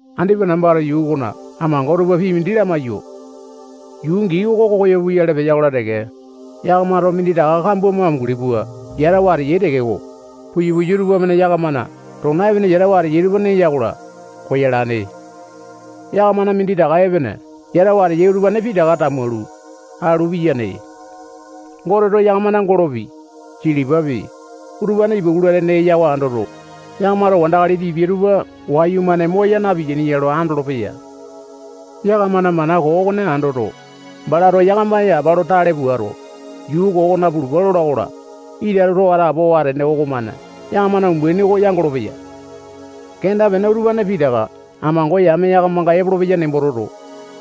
Andipa nambato yuu okona amango tupa pii mindi lamaiyo. Yuu gii oko koyo puyale peya-kola teke, yakamato minditaka kambua mo amunguli pua yatawa ateyai tekeko, puya-puya tupamane yakamana tona epene yatawa ateyai tupa neya-kola, koyalane. Yakamana minditaka epene yatawa ateyai utupane pitaka tamualu, alu piyane. Goteto yakamana golopi, silipapi, utupane ipakula tene eya oko andoto, yakamato wandakali tipia tupa wayumane moya napeaini ya lo andolopeya. Yakamana mana koo okone andoto, balato yakama yapa lo tale puato, yuu koo okona pulupa lola-kola, ita too atapowa atene okomane yakamana umbaini oko yangolo-peya. Kenda-pene utupane pitaka amango yame yakamanga epolopeya nembo toto,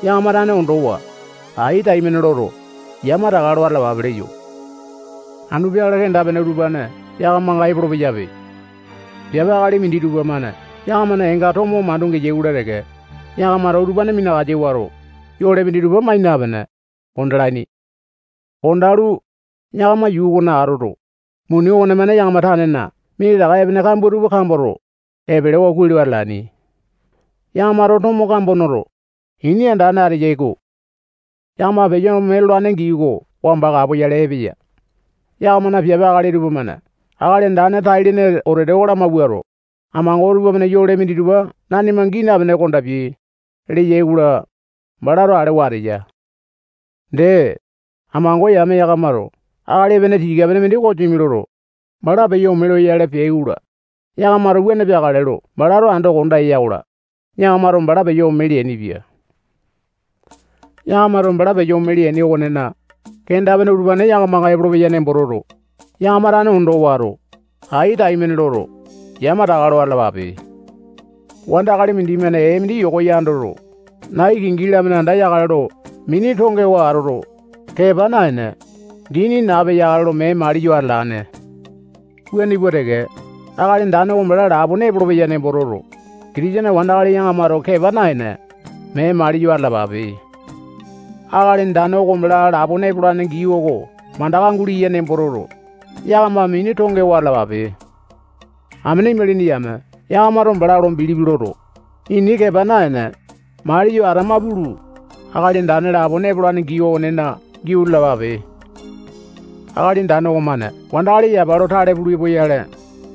yakama tane ondowa, ai taimane loto, yamataka lo atalapape leyo. Anu peakale kenda-pene utupane yakamanga epolo-peyape. Piape akali minditupa-mane yakamana eenga tomo mandu geyai-kola teke, yakamato utupane minakasa wato, yole minditupa mai napene, kondalaini. Kondalu, yakama yuu okona atoto, muni okonemane yakama tanena minditaka epene kambua tupa kamboto, epelewa kuai lo atalaini. Yakamato tomo kambua noto, ini andane ateyai-ko. Yakama peyo ome lolane gii oko wamba kapoyale epeya. Yakamana piape akali tupamane Akali Andane tai-lene wetete oko lamawuato, amango tupamane yole minditupa nanima gii napene kondapia, leyai-kola, balato alewa ateya. Dee, amango yame yakamato akali epene tika-pene mindi kosimi loto, bala peyo ome loyale peai-kola, yakamato wuane peakale lo balato ando konda ya-kola, yakamato bala peyo ome leainipia. Yakamato bala peyo ome leaini okonena, kenda-pene utupane yakamanga epolopeya nembo toto, yakama tane ondo wato, ai taimane loto, yamataka lo atalapape. Wandakali mindimane ee mindi yoko yandoto, nai kingi-lamane andayakale lo mini tongewa atoto, kepa naene, dini nape yakale lo mee maliyo atalane. Wuane pua teke, Akali Andane oko bala lapone epolopeya nembo toto, Kitisene wandakali yakamato kepa naene, mee maliyo atalapape. Akali Andane oko bala lapone epolane gii oko mandaka guleya nembo toto, yakama mini tongewa atalapape. Amene imalini yame yakamato bala lo bilipi loto, ini kepa naene, maliyo atama pulu, Akali Andane lapone epolane gii okonena giau lalapape. Akali Andane okomane wandakali yapa lo tale pulu epoyale,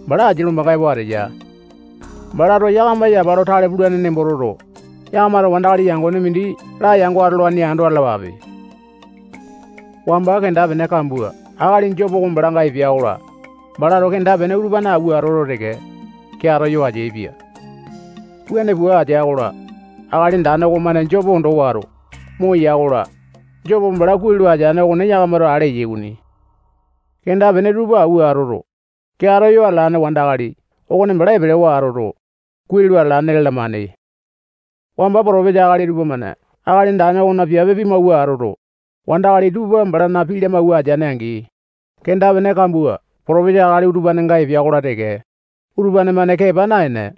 bala asia lombanga epo ateya. Balato yakama yapa lo tale pulane nembo toto, yakamato wandakali yangone mindi layango atolaini ando atalapape. Wamba kenda-pene kambua akali Jopo oko balanga epea-kola, balato kenda-pene utupane awua atoto teke, keato yo ateaipia. Wuane pua atea-kola, Akali Andane okomane Jopo ondo wato, moya-kola, Jopo bala kuai lo ateane okone yakamato ale yai okoni. Kenda-pene tupa awua atoto, keato yo atalane wandakali okone bala epelewa atoto, kuai lo atalane lalamane. Wamba potopesa akali tupamane Akali Andane okona piape pimawua atoto, wandakali tupa balana pii lamawua ateaini-angi, kenda-pene kambua potopesa akali utupanenga epea-kola teke, utupane-mane kepa naene,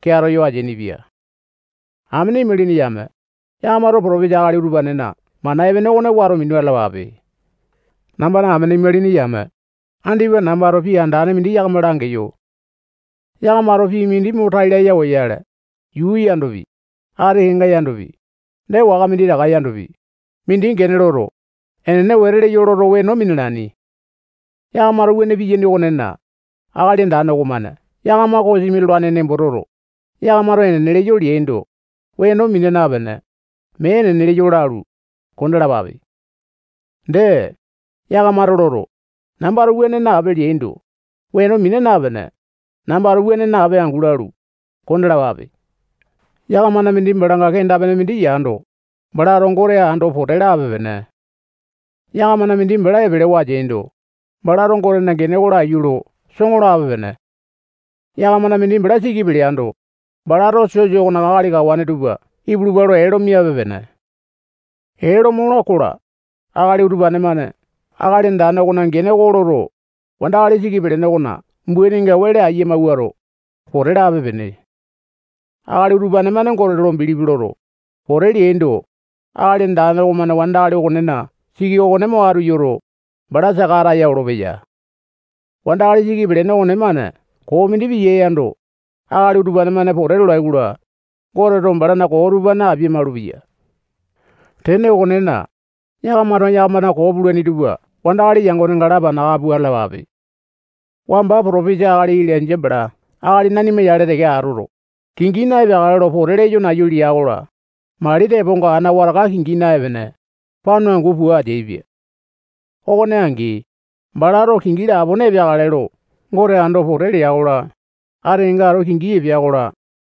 keato yo ateainipia. Amene imalini yame, yakamato potopesa akali utupanena mana epene okone wato minu atalapape. Nambana amene imalini yame, andipa nambato pii andane mindi yakama langeyo. Yakamato pii mindi mo tai laya oyale, yuu yandopi, ati kenga yandopi, dee waka minditaka yandopi, mindi gene loto, enene wete leyo loto weno minalaini. Yakamato wuane piyaini okonena, Akali Andane okomane yakama kosimi lolane nembo toto, yakamato enene leyo leaindo, weno mina napene, mee enene leyo lalu, kondalapape. Dee, yakamato loto, nambato wuane nape leaindo, weno mina napene, nambato wuane nape angu lalu, kondalapape. Yakamana mindi balanga kenda-pene mindi yando, balato Gote ando pote lape-pene. Yakamana mindi bala epelewa ateando, balato Gotena gene oko laiyu lo soŋo lape-pene. Yakamana mindi bala siki peleando, balato sosa okona akali kawane tupa ipulupa lo ee lo miape-pene. Ee lo mola-kola, akali utupane-mane Akali Andane okona gene oko loto, wandakali siki pelene okona umbaininga wele aiya mawuato, pote lape-pene. Akali utupane-mane Gote lo bilipi loto, pote leaindo, Akali Andane okomane wandakali okonena siki okone mo atu yoto, bala saka ataya olopeya. Wandakali siki pelene okonemane koo mindi piyae yando, akali utupane-mane pote lolai-kola, Goteto balana koo utupane apia-malupeya. Tene okonena, yakamato yakamana koo pulaini tupa wandakali yangonenga lapana aka pua atalapape. Wamba potopesa akali Ilainja bala akali nanima yale teke atoto, kingi na-epeakale lo pote leyo nayu lea-kola, mali teponga ana wataka kingi naepene, panyu angu pua ateaipia. Okone angi, balato kingi lapone epeakale lo Gote ando pote lea-kola, ati kenga ato kingi epea-kola,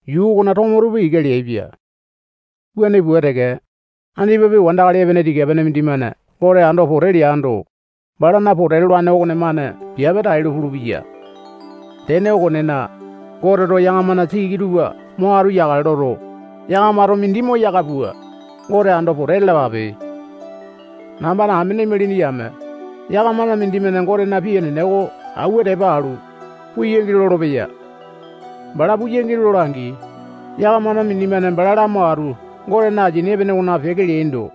yuu okona tomo tupa ika leaipia. Wuane pua teke, andipapi wandakali epene tika-pene mindimane Gote ando pote leando, balana pote lolane okonemane piape tailo pulupeya. Tene okonena, Goteto yakamana siki tupa mo atu yakale loto, yakamato mindi moyaka pua, Gote ando pote lalapape. Nambana amene imalini yame, yakamana mindimane Gotena pii enene oko awua tepa alu, puu yangi lolopeya. Bala puyangi lola-angi, yakamana mindimane bala lamo atu Gotena asini epene okona peke leaindo,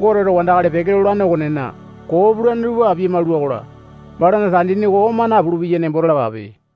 Goteto wandakali peke lolane okonena koo pulane tupa apia maula-kola, balana tandini oko oma napulu-peya nembo talapape.